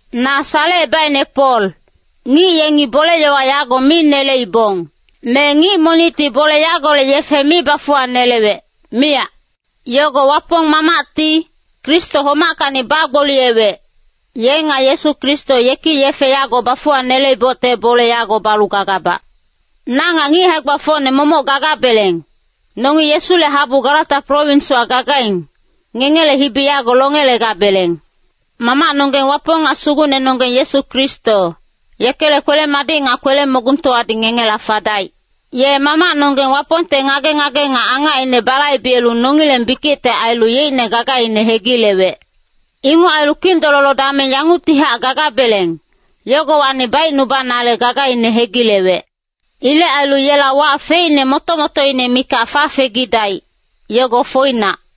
Na Salecebaicne Pol. Ngic yengi bole-yowa yago mi neleibong. Me ngic monicti bole yagolec yefe mi bafuwanelewec, miyac. Yogo Wapong Mamacti, Kristo homackacni bagboliyewec, ye nga Yesu Kristo yeki yefe yago bafuwaneleibocte bole yago balu gagabac. Na nga ngic hae-gbafocne momoc gagabeleng, nongi Yesule habu Galata prowinswa gagaing, ngengele hibi yago longelegabeleng. Mamacnonggeng Wapong nga Sugucnenonggeng Yesu Kristo, yekele kwele-madic nga kwele-mogungtowadi ngengela fadaic. Ye Mamacnonggeng Wapongte ngage-ngage nga angacine balaibelu nongileng bikicte ailu yeicne gagaine hegilewec. Inguc ailu kindololo dameng yanguctihac gagabeleng, yogowacni baicnubanale gagaine hegilewec. Ilec ailu yela wac feicne moto-motoine mikac fafegidaic, yogo foinac.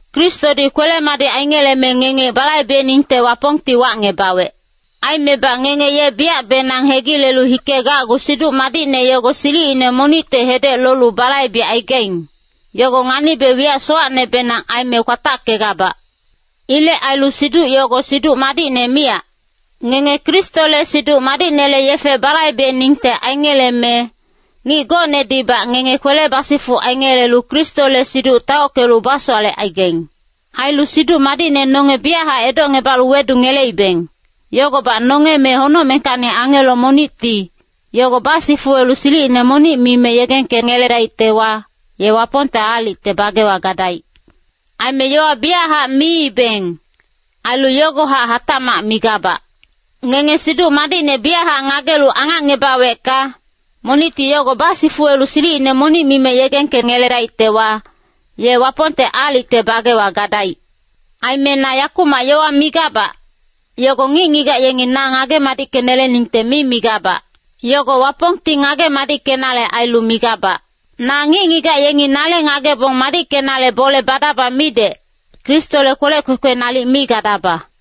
Kristodi kwele-madic aingeleme ngenge balaibeningte Wapongti wacngebawec. Aimebac ngenge ye biyacbenang hegilelu hikegacgu Siduc Madicne yogo silicine monicte hedec lolu balaibecaigaing, yogo nganibe wiyac sowacnebenang aime kwatackegabac. Ilec ailu siduc yogo Siduc Madicne miyac. Ngenge Kristole Siduc Madicnele yefe balaibeningte aingeleme, ngic gocnedibac ngenge kwele basifuc aingelelu Kristole siduc taockelu basowalecaigaing. Ailu Siduc Madicne nonge biyachac edocngebalu wedungeleibeng, yogobac nonge me honocmengkacni angelo monicti, yogo basifuwelu silicine monic mime yegengkengeledaictewa, ye Wapongte aalicte bagewa gadaic. Aime yowa biyachac miibeng, ailu yogohac hatacmac migabac. Ngenge Siduc Madicne biyachac ngagelu angacngebawecka, monicti yogo basifuwelu silicine monic mime yegengkengeledaictewa, ye Wapongte aalicte bagewa gadaic. Aime na yakumac yowa migabac, yogo ngic-ngigac yengi na ngage-madickeneleningte mi migabac. Yogo Wapongti ngage madickenale ailu migabac. Na ngic-ngigac yengi nale ngagebong madickenale bole badaba midec, Kristole kwelec kwekwe nalic mi gadaba.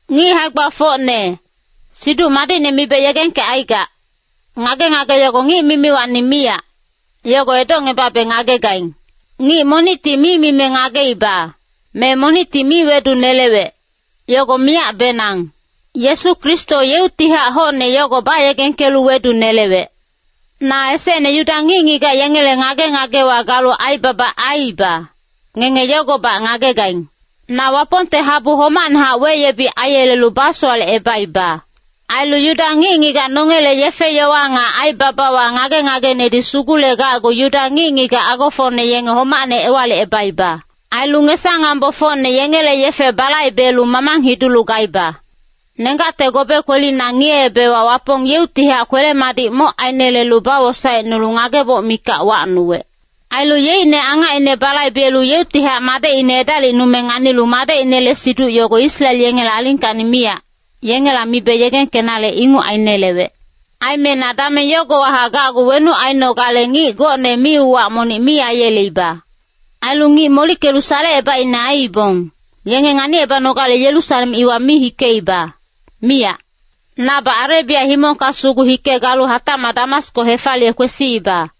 Ngic hae-gbafocne, Siduc Madicne mibe yegengkecaigac, ngage-ngage yogo ngic mimiwacni miyac, yogo edocngebabe ngagegaing. Ngic monicti mi mime ngageiba, me monicti mi wedunelewec, yogo miyacbenang. Yesu Kristo yeuctihac hocne yogo bayegengkelu wedunelewec. Na esecne Yuda ngic-ngigac yengele ngage-ngagewa galu aibaba aiiba, ngenge yogobac ngagegaing. Na Wapongte habu homacnehac weyebic aiyelelu basowalecebaiba. Ailu Yuda ngic-ngigac nongele yefe-yowa nga aibabawa ngage-ngagenedi sugulegacgu Yuda ngic-ngigac agofocne yenge homacne ewalicebaiba. Ailu ngesa-ngambofocne yengele yefe balaibelu mamang hidulu gaiba. Nenggacte gobe kwelina ngiyeebewa Wapong yeuctihac kwele-madic moc ainelelu bawosaecnulu ngageboc mikac wacnuwec. Ailu yeicne angacine balaibelu yeuctihac madecine edalicnume nganilu Madecinele siduc yogo Israel yengele alingkacni miyac, yengela mibe yegengkenale inguc ainelewec. Aime na dameng yogowahac gacgu wenuc ainogale ngic gocne mi-uwac monic mi aiyeleiba. Ailu ngic molickelu salecebaicne aiibong, yenge nganicebanogale Yerusalem iwa mi hikeiba, miyac. Nabac Arebia himongka sugu hike galu hatacmac Damasko hefaliye kwesiiba.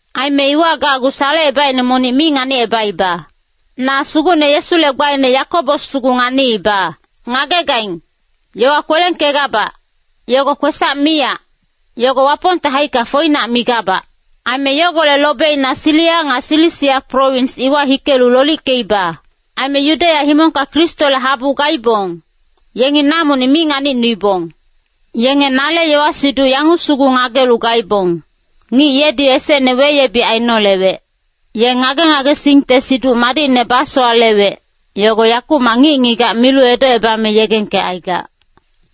Aime iwa gacgu salecebaicne monic mi nganicebaiba. Na Sugucne Yesule gbaine Yakobos sugu nganiiba. Ngagegaing, yowa kwelengkegabac, yogo kwesac miyac, yogo Wapongte haicka foinac migabac. Aime yogolec lobeina Siria nga Silisia prowins iwa hikelu lolickeiba. Aime Yudeya himongka Kristole habu gaibong, yengi na monic mi nganicnuibong. Yenge nale yowa-siduc yanguc sugu ngagelu gaibong, “Ngic yedi esecne weyebic ainolewec, ye ngage-ngagesingte Siduc Madicne basowalewec, yogo yakumac ngic-ngigac milu edocebame yegengkecaigac.”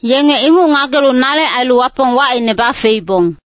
Yenge inguc ngagelu nale ailu Wapong wacine bafeibong.